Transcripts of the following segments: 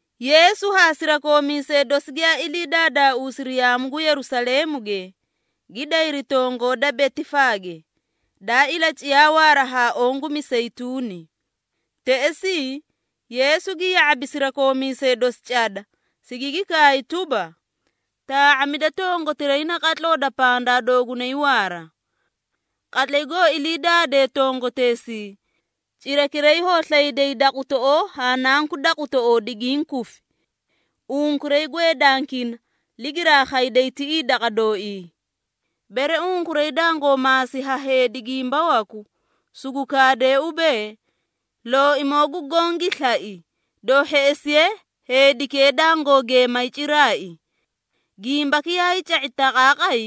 Yeesu haa sirakoomiisee dosi giyaa ilii daadaauusiri yaamu gu Yerusaleemuge, gi dayri tongoo da Betifaage, daa ilaciyaa waara haa oõ gu Miseyituuni. Teꞌesii, Yeesu gi ya⁄abi sirakoomiisee dosi cada, sigigi kaay tuba, “Taa⁄amida tongotiray naqatloo da pandaa doogunay waara. Qatlay goo ilii daadee tongoteesii, cirakiray hoo slayday daqutoꞌoo haa nanku daqutoꞌoo digiĩ kufi. Unkuray gweedankina, ligiraa khayday tiꞌii daqa dooii. Bere unkuray dangoo maasi ha heedi gimba waku, sugu kaadee ubee, ‘Looimoo gu Goõ gi slai,’ doo hheꞌesiye heedikee dangoo geemay ciraai.” Gimbaki yaay ca⁄i taqaaqay,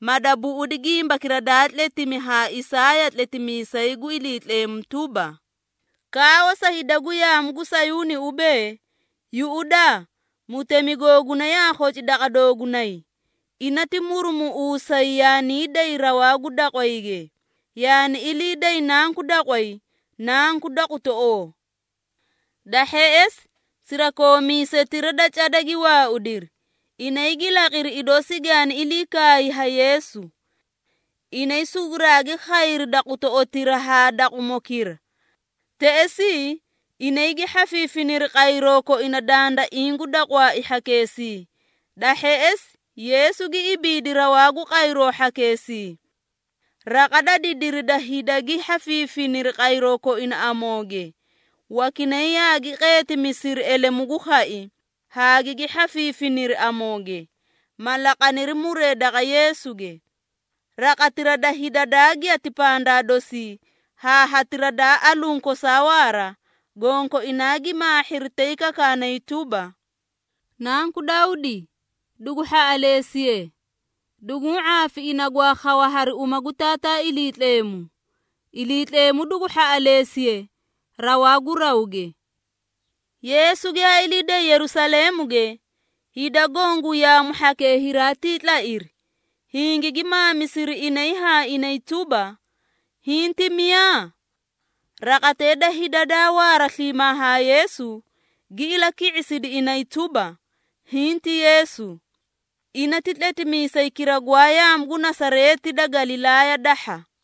ma dabuꞌudi gimbakira daa tletimi ha Isaaya tletimiisay gu Iliitleemu tuba, “Kaawa sa hida gu yaamu gu Sayuuni ubee, ‘Yuꞌudaa mutemi googuna yaa khoci daqa doogunay! Ina ti murumuꞌuusay yaanii day rawaa gu daqwayge, yaani ilii day nanku daqway, nanku daqutoꞌoo.’” Da hheꞌesi, sirakoomiisetira da cada gi waaudiri, inay gi laqiri idoo sigaani ilii kaay ha Yeesu. Inay suguraagi khayri daqutoꞌotira haa daqumokira. Teꞌesii, inay gi hhafiifiniri qayroo koina dandaiĩ gu daqwaai hhakeesii, da hheꞌesi Yeesu gi ibiidi rawaa gu qayroo hhakeesii. Raqa da didiri da hida gi hhafiifiniri qayroo koina amooge, wakinay yaagi qeetimisiri elemu gu khai, haa gigi hhafahhafiri amooge, ma laqaniri muree daqa Yeesuge. Raqatira da hida daa giyati pandaa dosii haa hatira daa aluũ kosaa waara, gonkoinaa gi maahhiri tay kakaanay tuba, “Nanku Dawdi, dugu hhaꞌaleesiye! Duguũ ⁄aafi ina gwaa khawa hari uma gu Taataa Iliitleemu! Iliitleemu dugu hhaꞌaleesiye rawaa gu rawge.” Yeesu giyaa ilii day Yerusaleemuge, hida goõ gu yaamu hhakee hiraatii tlairi, hingigi maamisiri inay haa inay tuba, “Hiĩ ti miyaa?” Raqatee da hida daa waara sliimaa haa Yeesu, gi ilaki⁄isidi inay tuba, “Hiĩ ti Yeesu. Ina ti tletimiisaykira gwaa yaamu gu Nasareeti da Galilaaya dahha.”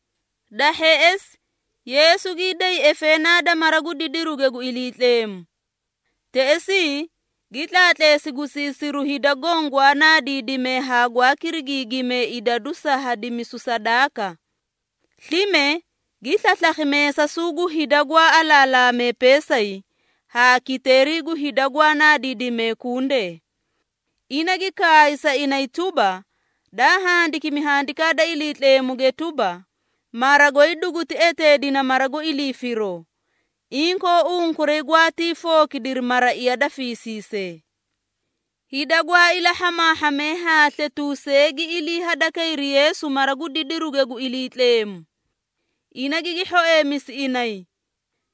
Da hheꞌesi, Yeesu gii day efeenaa da mara gu didiruge gu Iliitleemu. Teꞌesii, gi tlaatleesi gusiisiru hida goõ gwaa naadiidimee haa gwaa kirigiigimee idadu sa hadimisu sadaaka. Slime gi slaslakhi meesasuu gu hida gwaa alaalaamee peesay, haa kiteeri gu hida gwaa naadiidimee kundee. Ina gi kaay sa inay tuba, “Daa handikimi Handikaa da Iliitleemuge tuba, ‘Mara goy duguti eteedina mara gu ilii firoo.’ Inkoo unkuray gwaatii fookidiri ‘maraiya da fiisiisee.’” Hida gwaa ilahhamaahhamee haa sletuusee gi ilii hadakayri Yeesu mara gu didiruge gu Iliitleemu. Ina gigi hhoeemisi inay.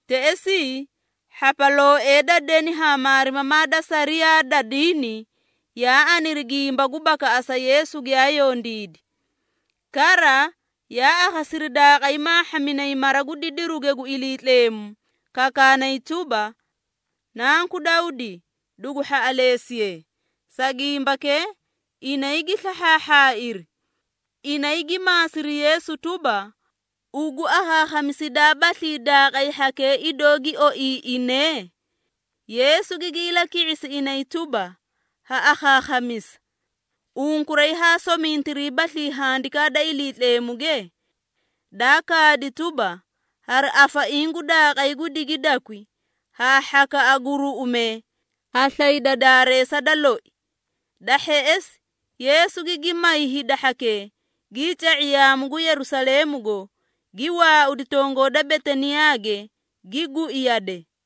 Teꞌesii, hhapalooee da deni haa maarimamaa da sariyaa da diini, yaa aniri gimba gu bakaꞌasa Yeesu giyaa yondiidi. Kara, yaa akhasiri daaqay maahhaminay mara gu didiruge gu Iliitleemu, kakaanay tuba, “Nanku Dawdi, dugu hhaꞌaleesiye.” Sa gimbakee, inay gi slahhaahhaairi. Inay gi maasiri Yeesu tuba, “Ugu akhaakhamisidaabaslii daaqay hhakee idoó gi oiiꞌinee?” Yeesu gigi ilaki⁄isi inay tuba, “Ha akhaakhamisa. Unkuray haa somintiriibaslii Handikaa da Iliitleemuge? Daa kaadi tuba, ‘Hari afaiĩ gu daaqay gu digidakwi, haa hhakaꞌa gu ruꞌumee, ha slayda daareesa da loi.’” Da hheꞌesi, Yeesu gigi may hida hhakee, gii ca⁄i yaamu gu Yerusaleemugo, gi waaudi tongoo da Betaniyaage, gi gui yade.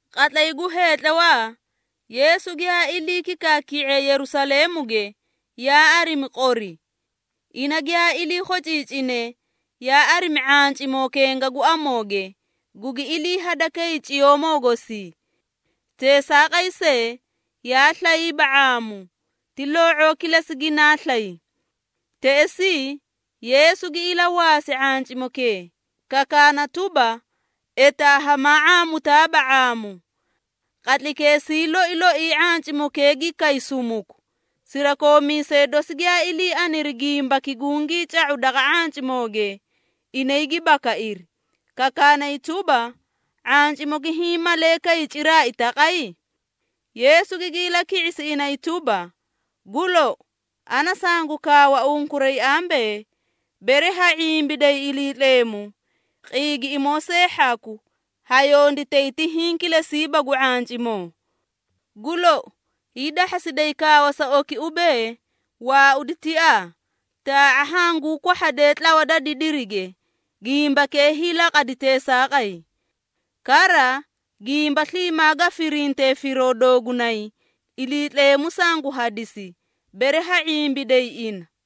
Qatlay gu heetlawaa, Yeesu giyaa ilii kikaaki⁄iye Yerusaleemuge, yaa arimi qori. Ina giyaa ilii khociicine, yaa arimi ⁄ancimoo kenga gu amooge, gugi ilii hadakay ciyoomoo gosii. Teesaaqay see, yaa slayba ⁄aamu, ti loo⁄oo kilesi ginaa slay. Teꞌesii, Yeesu gi ilawaasi ⁄ancimokee, kakaana tuba, “Etaa hamaa ⁄aamutaaba ⁄aamu.” Qatlaykeesii loi loii ⁄ancimokee gi kay sumuku. Sirakoomiisee dosi giyaa ilii aniri gimbaki gungii ca⁄u daqa ⁄ancimooge, inay gi bakairi, kakaanay tuba, “⁄ancimoki hiĩ malee kay ciraai taqay?” Yeesu gigi ilaki⁄isi inay tuba, “Gu lou, ana sangu kaawa unkuray ambee, bere ha ⁄imbiday Iliitleemu, qiigiꞌimoo see hhaku, ha yonditay ti hiĩ kilesiiba gu ⁄ancimoo. Gu lou, hiidahhasiday kaawa sa oki ubee, ‘Waaudi tiaa, taa⁄a hanguu kwahhade tlawa da didirige,’ gimbakee hiilaqadi teesaaqay. Kara, gimba sliimaa ga firintee firoo doogunay, Iliitleemu sangu hadisi, bere ha ⁄imbiday ina.”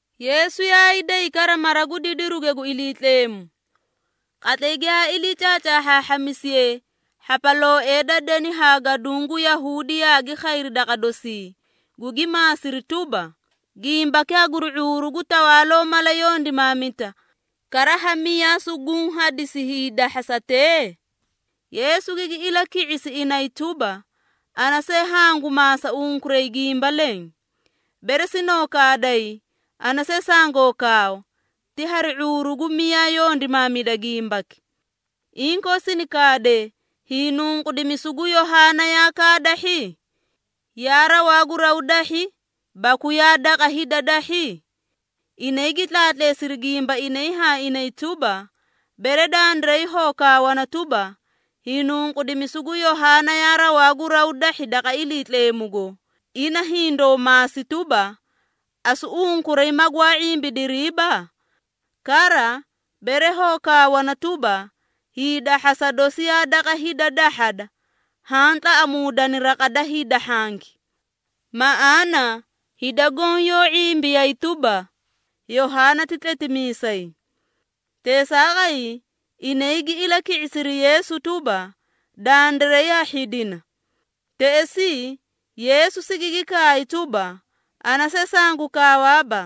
Yeesu yaay day kara mara gu didiruge gu Iliitleemu. Qatlay giyaa ilii caacaahhaahhamisiye, hhapalooee da deni haa gaduũ gu Yahuudi yaagi khayri daqa dosii, gugi maasiri tuba, “Gimbaki haguri ⁄uuru gu tawaaloo mala yondimaamita, kara ha miyaa suguũ hadisi hiidahhasatee?” Yeesu gigi ilaki⁄isi inay tuba, “Ana see hangu maasa unkuray gimba leẽ. Bere sinoo kaaday, ana see sangoo kaawa, ti hari ⁄uuru gu miyaa yondimaamida gimbaki. Inkoo sini kaadee, hiinunqudimisu gu Yohaana, yaa kaadahhi? Yaa rawaa gu raw dahhi, baku yaa daqa hida dahhi?” Inay gi tlaatleesiri gimba inay haa inay tuba, “Bere dandiray hoo kaawana tuba, hiinunqudimisu gu Yohaana yaa rawaa gu raw dahhi daqa Iliitleemugo, ina hindoo maasi tuba, ‘Asu unkuray magwaa ⁄imbidiriiba?’ Kara, bere hoo kaawana tuba, hiidahhasa dosi yaa daqa hida dahhada, haã tlaꞌamuudani raqati da hida hhanki. Maꞌaana, hida goõ yoó ⁄imbiyay tuba, Yohaana ti tletimiisay.” Teesaaqay, inay gi ilaki⁄isiri Yeesu tuba, “Dandiray ha hhidina.” Teꞌesii, Yeesu sigigi kaay tuba, “Ana see sangu kaawaaba,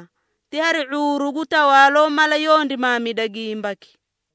ti hari ⁄uuru gu tawaaloo mala yondimaamida gimbaki.”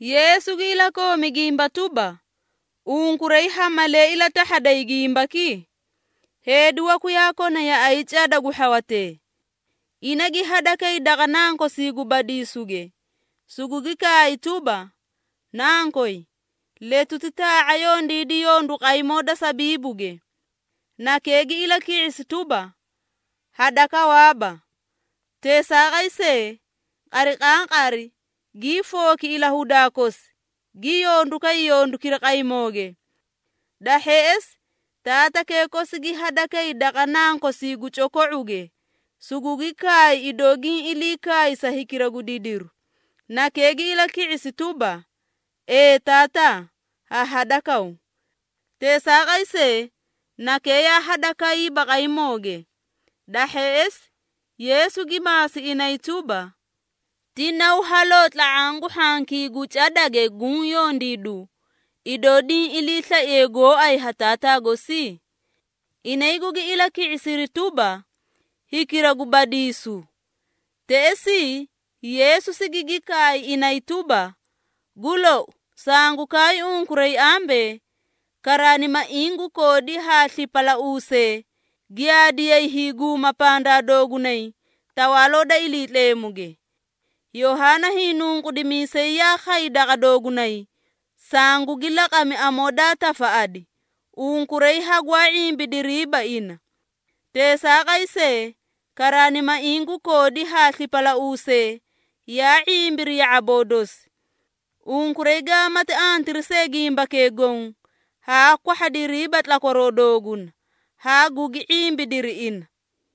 Yeesu gi ilakoomi gimba tuba, “Unkuray ha malee ilatahhaday gimbaki? Heedi waku yaa kona yaꞌay cada gu hhawatee. Ina gi hadakay daqa nankosii gu badiisuge, sugugi kaay tuba, ‘Nankoy, letuti taa⁄a yondiidi yondu qaymoo da sabiibuge.’ Nakee gi ilaki⁄isi tuba, ‘Hadakawaaba.’ Teesaaqay see, qariqaaqari gii fooki ilahudaa kosi, gi yondu kay yondukira qaymooge. Da hheꞌesi, taatakee kosi gi hadakay daqa nankosii gu coko⁄uge, sugugi kaay idoo giĩ ilii kaay sa hikira gu didiru. Nakee gi ilaki⁄isi tuba, ‘Ee taataa, ha hadakaw.’ Teesaaqay see, nakee yaa hadakayba qaymooge.” Da hheꞌesi, Yeesu gi maasi inay tuba, “Ti naw haloo tla⁄aã gu hhankii gu cadage guũ yondiidu, idoo diĩ iliislaiye gooay ha taataa gosi?” Inay gugi ilaki⁄isiri tuba, “Hikira gu badiisu.” Teꞌesii, Yeesu sigigi kaay inay tuba, “Gu lou, sangu kaay unkuray ambee, karaanimaiĩ gu koodi haa slipalauusee, giyaadiyay hiiguma pandaa doogunay, Tawaaloo da Iliitleemuge. Yohaana Hiinunqudimiisay yaa khay daqa doogunay, sangugi laqami amoo daa tafaꞌadi, unkuray hagwaa ⁄imbidiriiba ina. Teesaaqay see, karaanimaiĩ gu koodi haa slipalauusee, yaa ⁄imbiri ya⁄aboo dosi. Unkuray gaamati antiri see gimbakee goõ, haa kwahhadiriiba tlakwaroo dooguna, haa gugi ⁄imbidiri ina.”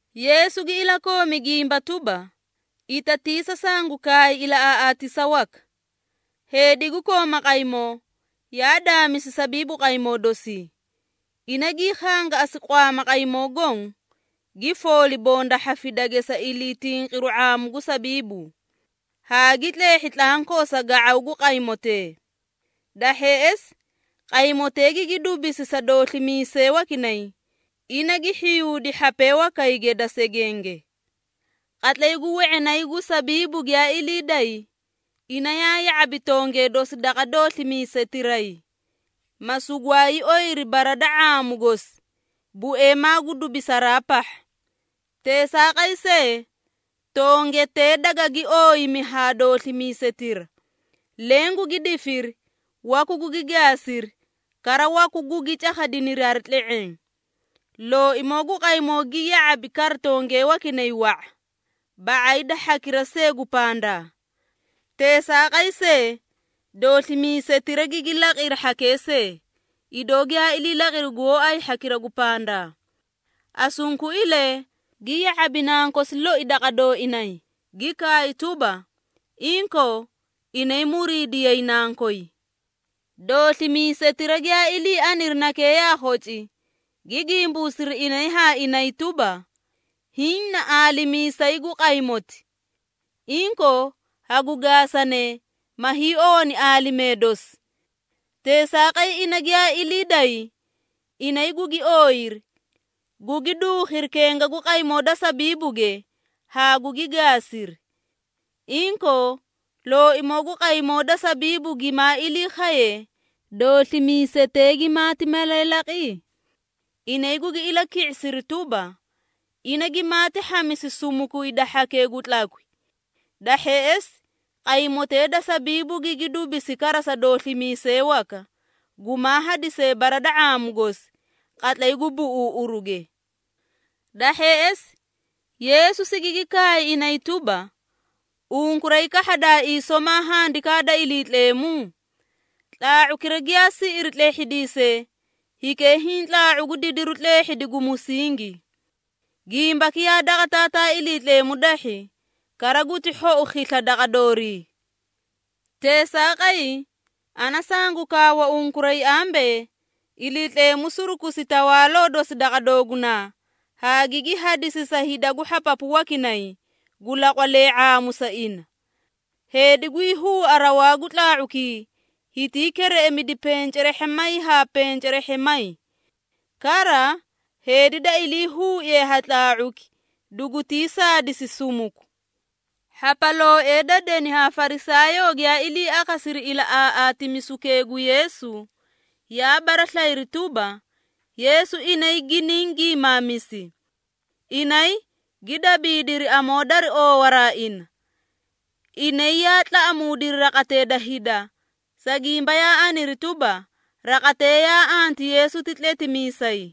Yeesu gi ilakoomi gimba tuba, “Itatiisa sangu kaay ilaꞌaaꞌaatisa waka. Heedi gu kooma qaymoo, yaa daamisi sabiibu qaymoo dosii. Ina gii khangaꞌasi qwaama qaymoo goõ, gi fooli bonda hhafidage sa iliitinqiru ⁄aamu gu sabiibu, haa gi tleehhi tlankoo sa ga⁄aw gu qaymootee. Da hheꞌesi, qaymotee gigi dubisi sa dooslimiisee wakinay, ina gi hhiyuudi hhapee wakayge da segenge. Qatlay gu we⁄inay gu sabiibu giyaa ilii day, ina yaa ya⁄abi tongee dosi daqa dooslimiisetiray, ma sugwaay oyiri bara da ⁄aamu gosi, bueemaa gu dubisaraa pahha. Teesaaqay see, tongetee dagagi ooyimi ha dooslimiisetira, leẽ gugi difiri, waku gugi gaasiri, kara waku gugi cakhadiniri hari tle⁄eẽ. Looimoo gu qaymoo gi ya⁄abi kara tongee wakinay wa⁄a, ba⁄ay da hhakira see gu pandaa. Teesaaqay see, dooslimiisetira gigi laqiri hhakee see, idoo giyaa laqiri gooay hhakira gu pandaa. Asunkuilee, gi ya⁄abi nankosi loi daqa dooinay, gi kaay tuba, ‘Inkoo, inay muriidiyay nankoy.’ Dooslimiisetira giyaa ilii aniri nakee yaa khoci, gi gimbuusiri inay haa inay tuba, ‘Hiĩ na aalimiisayi gu qaymoti. Inkoo, hagu gaasanee, ma hiiowani aalimee dosi.’ Teesaaqay ina giyaa ilii day, inay gugi ooyiri, gugi duukhiri kenga gu qaymoo da sabiibuge, haa gugi gaasiri. Inkoo, looimoo gu qaymoo da sabiibu gimaa ilii khaye, dooslimiisetee gimaati malee laqi?” Inay gugi ilaki⁄isiri tuba, “Ina gimaati hhamisi sumuku hida hhakee gu tlakwi. Da hheꞌesi, qaymotee da sabiibu gigi dubisi kara sa dooslimiisee waka, gumaa hadisee bara da ⁄aamu gosi, qatlay gu buꞌuuꞌuruge.” Da hheꞌesi, Yeesu sigigi kaay inay tuba, “Unkuray kahhadaaii somaa Handikaa da Iliitleemu? ‘Tlaa⁄ukira giyaa siꞌiri tlehhidiisee, hikee hiĩ tlaa⁄u gu didiru tleehhidi gu musingi. Gimbaki yaa daqa Taataa Iliitleemu dahhi, kara guti hhou khisla daqa doorii.’ Teesaaqay, ana sangu kaawa unkuray ambee, Iliitleemu surukusi Tawaaloo dosi daqa doogunaa, haa gigi hadisi sa hida gu hhapapu wakinay, gu laqwalee ⁄aamu sa ina. Heedi gwii huua rawaa gu tlaa⁄ukii, hitii kereꞌemidi pencerehhemay haa pencerehhemay. Kara, heedi da iliihuuiye ha tlaa⁄uki, dugutii saadisi sumuku.” Hhapalooee da deni haa Farisaayoo giyaa ilii akhasiri ilaꞌaaꞌaatimisukee gu Yeesu, yaa baraslayiri tuba, Yeesu inay giniĩ giimaamisi. Inay, gi dabiidiri amoo dari oowaraa ina. Inay yaa tlaꞌamuudiri raqatee da hida, sa gimba yaa aniri tuba, raqatee yaa anti Yeesu ti tletimiisay.